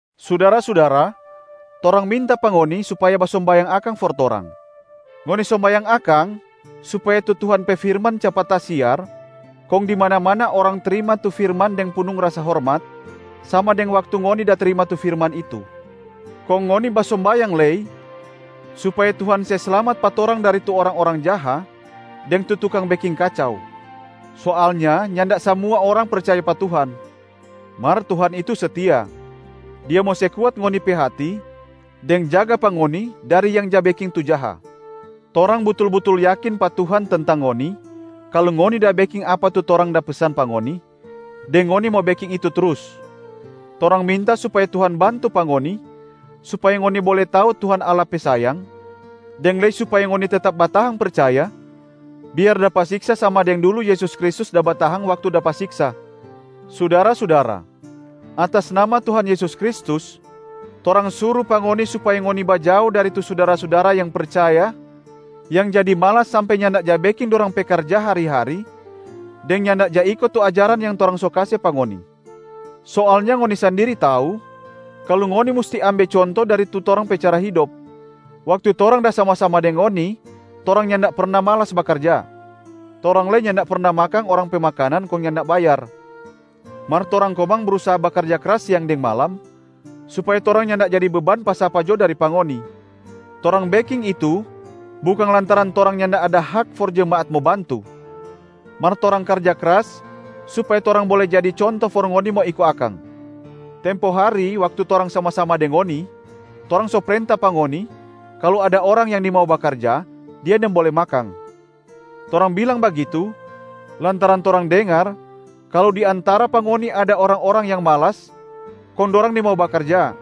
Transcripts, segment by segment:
Sudara-sudara, torang minta pa ngoni supaya basombayang akang for torang. Ngoni sombayang akang supaya tu Tuhan pe firman capat tasiar kong di mana-mana orang trima tu firman deng punung rasa hormat, sama deng waktu ngoni da trima tu firman itu. Kong ngoni basombayang lei supaya Tuhan se slamat pa torang dari tu orang-orang jaha deng tu tukang beking kacau. Soalnya nyanda samua orang percaya pa Tuhan. Mar Tuhan itu setia. Dia mo se kuat ngoni pe hati deng jaga pa ngoni dari yang ja beking tu jaha. Torang butul-butul yakin pa Tuhan tentang ngoni kalu ngoni da beking apa tu torang da pesan pa ngoni, deng ngoni mo beking itu trus. Torang minta supaya Tuhan bantu pa ngoni, supaya ngoni bole tau Tuhan Allah pe sayang, deng lei supaya ngoni tetap batahang percaya biar dapa siksa sama deng dulu Yesus Kristus da batahang waktu dapa siksa. Sudara-sudara, atas nama Tuhan Yesus Kristus, torang suru pa ngoni supaya ngoni bajao dari tu sudara-sudara yang percaya yang jadi malas sampe nyanda ja beking dorang pe karja hari-hari deng nyanda ja iko tu ajaran yang torang so kase pa ngoni. Soalnya ngoni sandiri tau kalu ngoni musti ambe conto dari tu torang pe cara hidop, waktu torang da sama-sama deng ngoni torang nyanda perna malas bakarja. Torang lei nyanda perna makang orang pe makanan kong nyanda bayar. Mar torang komang brusaha bakarja kras siang deng malam supaya torang nyanda jadi beban pa sapa jo dari pa ngoni. Torang beking itu bukang lantaran torang nyanda ada hak for jemaat mo bantu, mar torang karja kras supaya torang bole jadi conto for ngoni mo iko akang. Tempo hari waktu torang sama-sama deng ngoni, torang so prenta pa ngoni kalu ada orang yang nimau bakarja, dia nimbole makang. Torang bilang bagitu lantaran torang dengar kalu di antara pa ngoni ada orang-orang yang malas kong dorang nimau bakarja,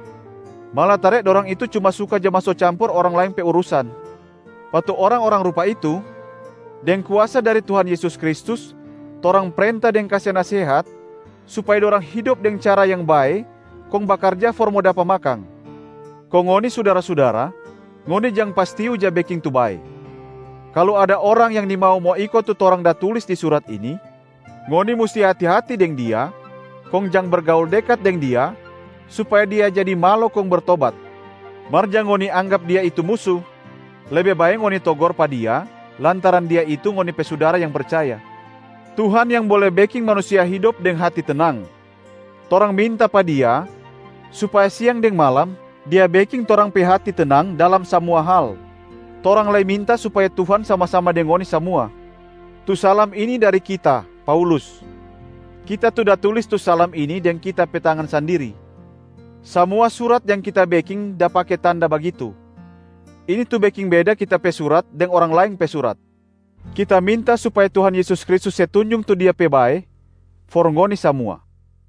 malatare dorang itu cuma suka ja maso campur orang laeng pe urusan. Pa tu orang-orang rupa itu, deng kuasa dari Tuhan Yesus Kristus, torang prenta deng kase nasehat supaya dorang hidop deng cara yang bae kong bakarja for mo dapa makang. Kong ngoni sudara-sudara, ngoni jang pastiu ja beking tu bae. Kalu ada orang yang nimau mo iko tu torang da tulis di surat ini, ngoni musti hati-hati deng dia kong jang bergaul dekat deng dia supaya dia jadi malo kong bertobat. Mar jang ngoni anggap dia itu musu, lebe bae ngoni togor pa dia lantaran dia itu ngoni pe sudara yang percaya. Tuhan yang bole beking manusia hidop deng hati tenang, torang minta pa Dia supaya siang deng malam Dia beking torang pe hati tenang dalam samua hal. Torang lei minta supaya Tuhan sama-sama deng ngoni samua. Tu salam ini dari kita, Paulus. Kita tu da tulis tu salam ini deng kita pe tangan sandiri. Samua surat yang kita beking da pake tanda bagitu. Ini tu beking beda kita pe surat deng orang laeng pe surat. Kita minta supaya Tuhan Yesus Kristus se tunjung tu Dia pe bae for ngoni samua.